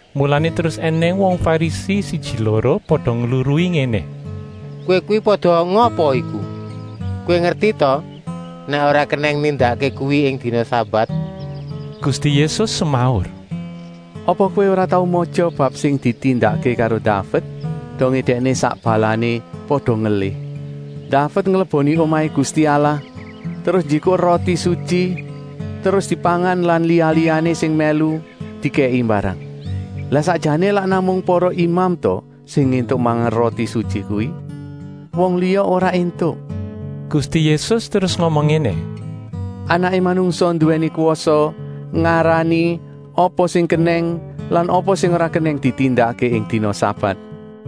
Mulané terus ènèng wong Farisi siji-loro pada ngluruhi ngéné: “Kowé kuwi pada ngapa iku. Kowé ngerti ta nèk ora kenèng nindakké kuwi ing dina sabat!” Gusti Yésus semaur: “Apa kowé ora tau matya bab sing ditindakké karo Daved, dongé dèkné sak balané pada ngelih. Daved ngleboni omahé Gusti Allah, terus njikuk roti sutyi terus dipangan lan liya-liyané sing mèlu dikèki mbarang. Lah sakjané lak namung para imam ta sing éntuk mangan roti sutyi kuwi? Wong liya ora éntuk!” Gusti Yésus terus ngomong ngéné: “Anaké Manungsa nduwèni kwasa ngarani apa sing kenèng lan apa sing ora kenèng ditindakké ing dina sabat.”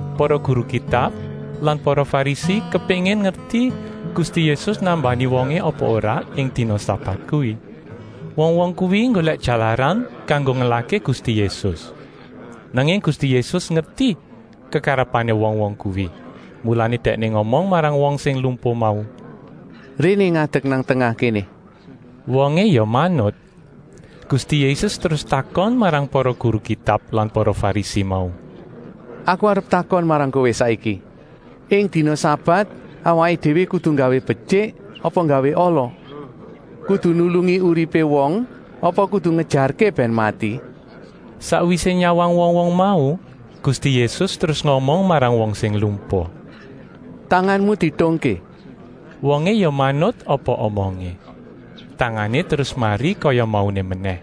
Para guru Kitab lan para Farisi kepéngin ngerti Gusti Yésus nambani wongé apa ora ing dina sabat kuwi. Wong-wong kuwi nggolèk jalaran kanggo ngelahké Gusti Yésus. Nanging Gusti Yésus ngerti kekarepané wong-wong kuwi, mulané Dèkné ngomong marang wong sing lumpuh mau: “Réné ngadek nang tengah kéné.” Wongé ya manut. Gusti Yésus terus takon marang para guru Kitab lan para Farisi mau: “Aku arep takon marang kowé saiki: ing dina sabat awaké déwé kudu nggawé betyik apa nggawé ala. Kudu nulungi uripé wong apa kudu ngejarké bèn mati?” Sakwisé nyawang wong-wong mau Gusti Yésus terus ngomong marang wong sing lumpuh: “Tanganmu dietungké!” Wongé ya manut apa omongé, tangané terus mari kaya mauné menèh.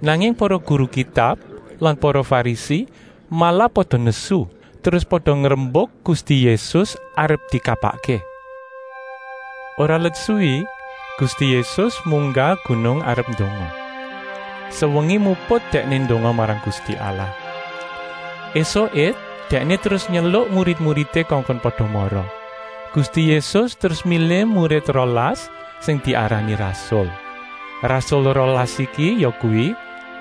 Nanging para guru Kitab lan para Farisi malah pada nesu, terus pada ngrembuk Gusti Yésus arep dikapakké. Ora let suwi Gusti Yésus munggah gunung arep ndonga. Sewengi muput Dèkné ndonga marang Gusti Allah. Esuké Dèkné terus nyeluk murid-muridé kongkon pada mara. Gusti Yésus terus milih murid rolas sing diarani rasul. Rasul rolas iki yakuwi: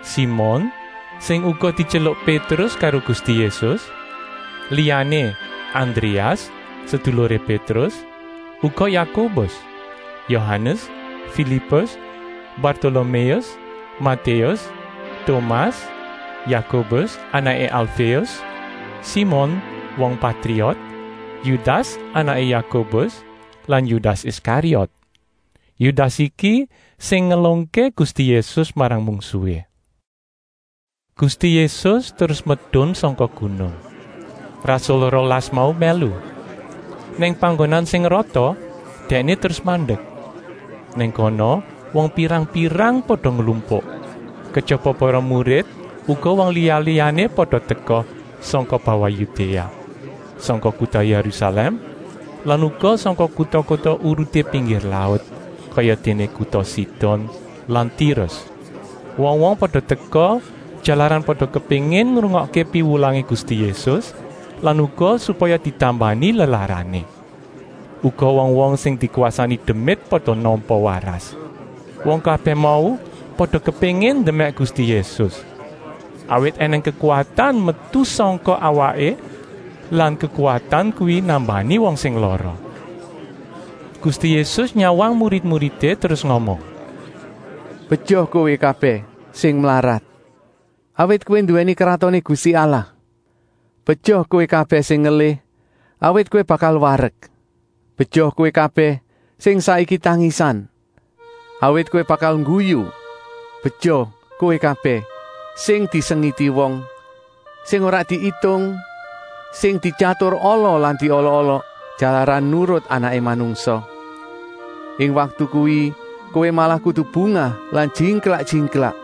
Simon, sing uga dityeluk Pétrus karo Gusti Yésus. Liyané Andréas, seduluré Pétrus. Uga Yakobus, Yohanes, Filipus, Bartoloméus, Matéus, Tomas, Yakobus anaké Alféus, Simon wong Patriot, Yudas anaké Yakobus lan Yudas Iskariot. Yudas iki sing ngelungké Gusti Yésus marang mungsuhé. Gusti Yésus terus medun sangka gunung. Rasul rolas mau mèlu. Nang panggonan sing rata Dèkné terus mandek. Nang kono wong pirang-pirang pada nglumpuk. Kejaba para murid uga wong liya-liyané pada teka sangka bawah Yudéa, sangka kuta Yérusalèm lan uga sangka kuta-kuta uruté pinggir laut, kayadéné kuta Sidon lan Tirus. Wong-wong pada teka, jalaran pada kepéngin ngrungokké piwulangé Gusti Yésus lan uga supaya ditambani lelarané. Uga wong-wong sing dikwasani demit pada nampa waras. Wong kabèh mau pada kepéngin ndemèk Gusti Yésus, awit ènèng kekuwatan metu sangka awaké lan kekuwatan kuwi nambani wong sing lara. Gusti Yésus nyawang murid-muridé terus ngomong: “Beja kowé kabèh sing mlarat, awit kowé kuwi nduwèni Kratoné Gusti Allah. Beja kowé kabèh sing ngelih, awit kowé bakal warek. Beja kowé kabèh sing saiki tangisan, awit kowé bakal ngguyu. “Beja kowé kabèh sing disengiti wong, sing ora diitung, sing dityatur ala lan diolok-olok jalaran nurut Anaké Manungsa. Ing waktu kuwi kowé malah kudu bungah lan jingklak-jingklak,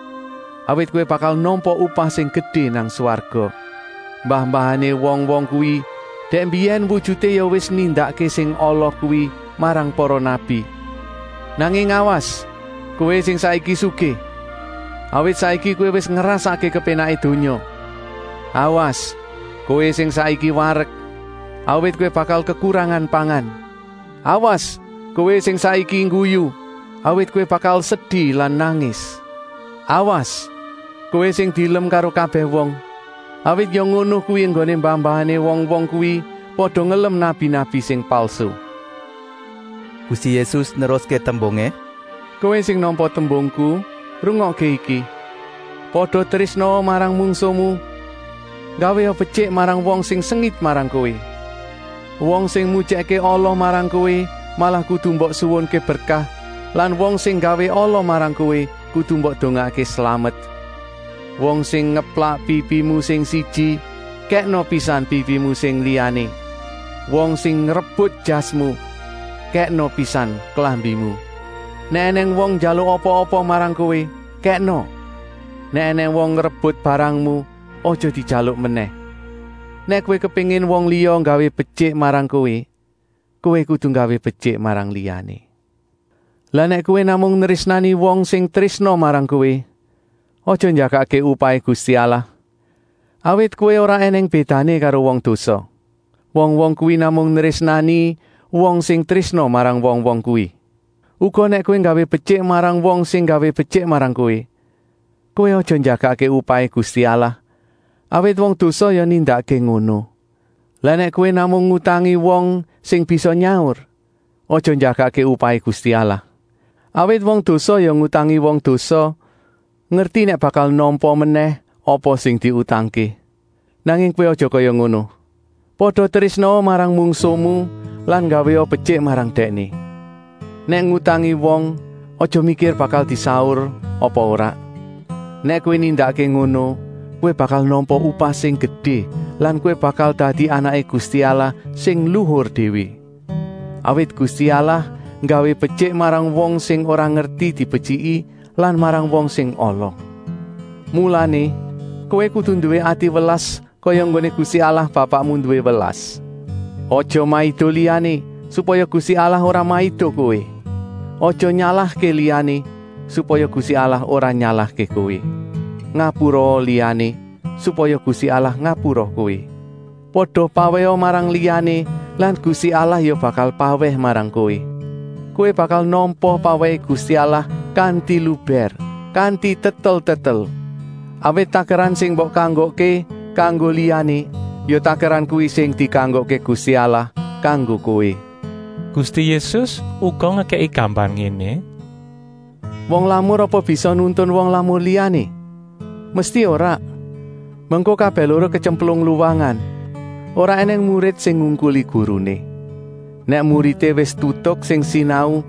awit kowé bakal nampa upah sing gedé nang swarga. Mbah-mbahané wong-wong kuwi dèk mbiyèn wujuté ya wis nindakké sing ala kuwi marang para nabi. Nanging awas, kowé sing saiki sugih, awit saiki kowé wis ngrasakké kepénaké donya. Awas, kowé sing saiki warek, awit kowé bakal kekurangan pangan. Awas kowé sing saiki ngguyu, awit kowé bakal sedi lan nangis. “Awas, kowé sing dielem karo kabèh wong, awit ya ngono kuwi enggoné mbah-mbahané wong-wong kuwi pada ngelem nabi-nabi sing palsu.” Gusti Yésus neruské tembungé: “Kowé sing nampa tembungku, rungokké iki: pada trésnaa marang mungsuhmu, nggawéa betyik marang wong sing sengit marang kowé. Wong sing mujèkké ala marang kowé malah kudu mbok suwunké berkah lan wong sing nggawé ala marang kowé kudu mbok dongaké slamet. Wong sing ngeplak pipimu sing siji, kèkna pisan pipimu sing liyané. Wong sing ngrebut jasmu, kèkna pisan klambimu. Nèk ènèng wong njaluk apa-apa marang kowé, kèkna. Nèk ènèng wong ngrebut barangmu, aja dijaluk menèh. Nèk kowé kepéngin wong liya nggawé betyik marang kowé, kowé kudu nggawé betyik marang liyané. “Lah nèk kowé namung nrésnani wong sing trésna marang kowé, aja njagakké upahé Gusti Allah, awit kowé ora ènèng bédané karo wong dosa. Wong-wong kuwi namung nrésnani wong sing trésna marang wong-wong kuwi. Uga nèk kowé nggawé betyik marang wong sing nggawé betyik marang kowé, kowé aja njagakké upahé Gusti Allah, awit wong dosa ya nindakké ngono. Lah nèk kowé namung ngutangi wong sing bisa nyaur, aja njagakké upahé Gusti Allah. Awit wong dosa ya ngutangi wong dosa, ngerti nèk bakal nampa menèh apa sing diutangké. Nanging kowé aja kaya ngono! Pada trésnaa marang mungsuhmu lan nggawéa betyik marang dèkné. Nèk ngutangi wong, aja mikir bakal disaur apa ora. Nèk kowé nindakké ngono, kowé bakal nampa upah sing gedé lan kowé bakal dadi anaké Gusti Allah sing luhur déwé. Awit Gusti Allah nggawé betyik marang wong sing ora ngerti dibetyiki lan marang wong sing ala. Mulané kowé kudu nduwé ati welas kaya enggoné Gusti Allah Bapakmu nduwé welas. “Aja maido liyané, supaya Gusti Allah ora maido kowé. Aja nyalahké liyané, supaya Gusti Allah ora nyalahké kowé. Ngapuraa liyané, supaya Gusti Allah ngapura kowé. Pada pawèha marang liyané lan Gusti Allah ya bakal pawèh marang kowé. Kowé bakal nampa pawèhé Gusti Allah kanti lubèr, kanti tetel-tetel. Awit takeran sing mbok kanggokké kanggo liyané, ya takeran kuwi sing dikanggokké Gusti Allah kanggo kowé.” Gusti Yésus uga ngekèki gambar ngéné: “Wong lamur apa bisa nuntun wong lamur liyané? Mesti ora! Mengko kabèh loro ketyemplung luwangan. Ora ènèng murid sing ngungkuli guruné. Nèk muridé wis tutuk sing sinau,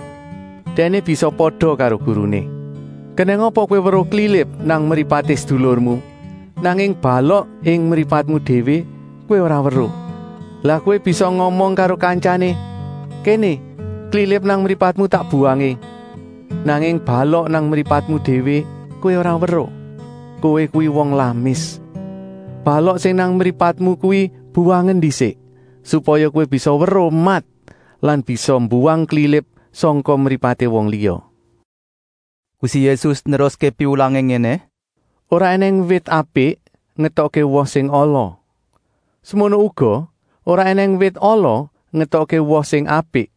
dèkné bisa pada karo guruné. “Kenèng apa kowé weruh klilip nang mripaté sedulurmu, nanging balok ing mripatmu déwé kowé ora weruh. Lah kowé bisa ngomong karo kantyané: ‘Kéné klilip nang mripatmu tak buwangé,’ nanging balok nang mripatmu déwé kowé ora weruh. Kowé kuwi wong lamis. Balok sing nang mripatmu kuwi buwangen ndisik, supaya kowé bisa weruh mat lan bisa mbuwang klilip sangka mripaté wong liya.” Gusti Yésus neruské piwulangé ngéné: “Ora ènèng wit apik ngetokké woh sing ala. Semono uga ora ènèng wit ala ngetokké woh sing apik.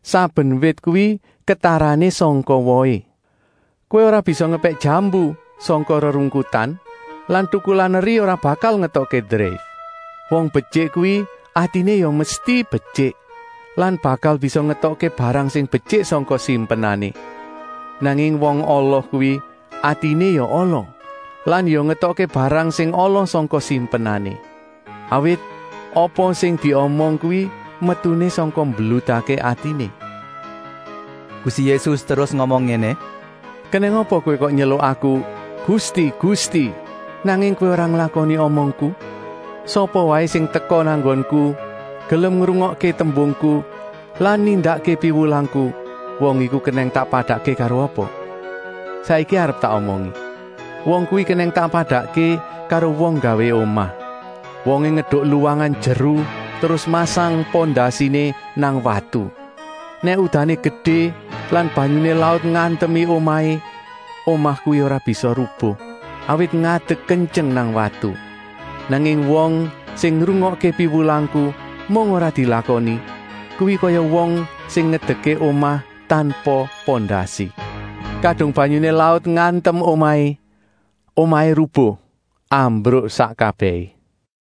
Saben wit kuwi ketarané sangka wohé. Kowé ora bisa ngepèk jambu sangka rerungkutan lan tukulan eri ora bakal ngetokké dreif. Wong betyik kuwi atiné ya mesti betyik lan bakal bisa ngetokké barang sing betyik sangka simpenané. Nanging wong ala kuwi atiné ya ala lan ya ngetokké barang sing ala sangka simpenané. Awit apa sing diomong kuwi metuné sangka mbludakké atiné.” Gusti Yésus terus ngomong ngéné: “Kenèng apa kowé kok nyeluk Aku: ‘Gusti, Gusti,’ nanging kowé ora nglakoni omongku? Sapa waé sing teka nang nggonku, gelem ngrungokké tembungku lan nindakké piwulangku, wong iku kenèng tak padakké karo apa? Saiki arep tak omongi. Wong kuwi kenèng tak padakké karo wong nggawé omah. Wongé ngeduk luwangan jeru terus masang pondasiné nang watu. Nèk udané gedé lan banyuné laut ngantemi omahé, omah kuwi ora bisa rubuh, awit ngadek kentyeng nang watu. Nanging wong sing ngrungokké piwulangku, mung ora dilakoni, kuwi kaya wong sing ngedekké omah tanpa pondasi. Kadung banyuné laut ngantem omahé, omahé rubuh, ambruk sak kabèhé.”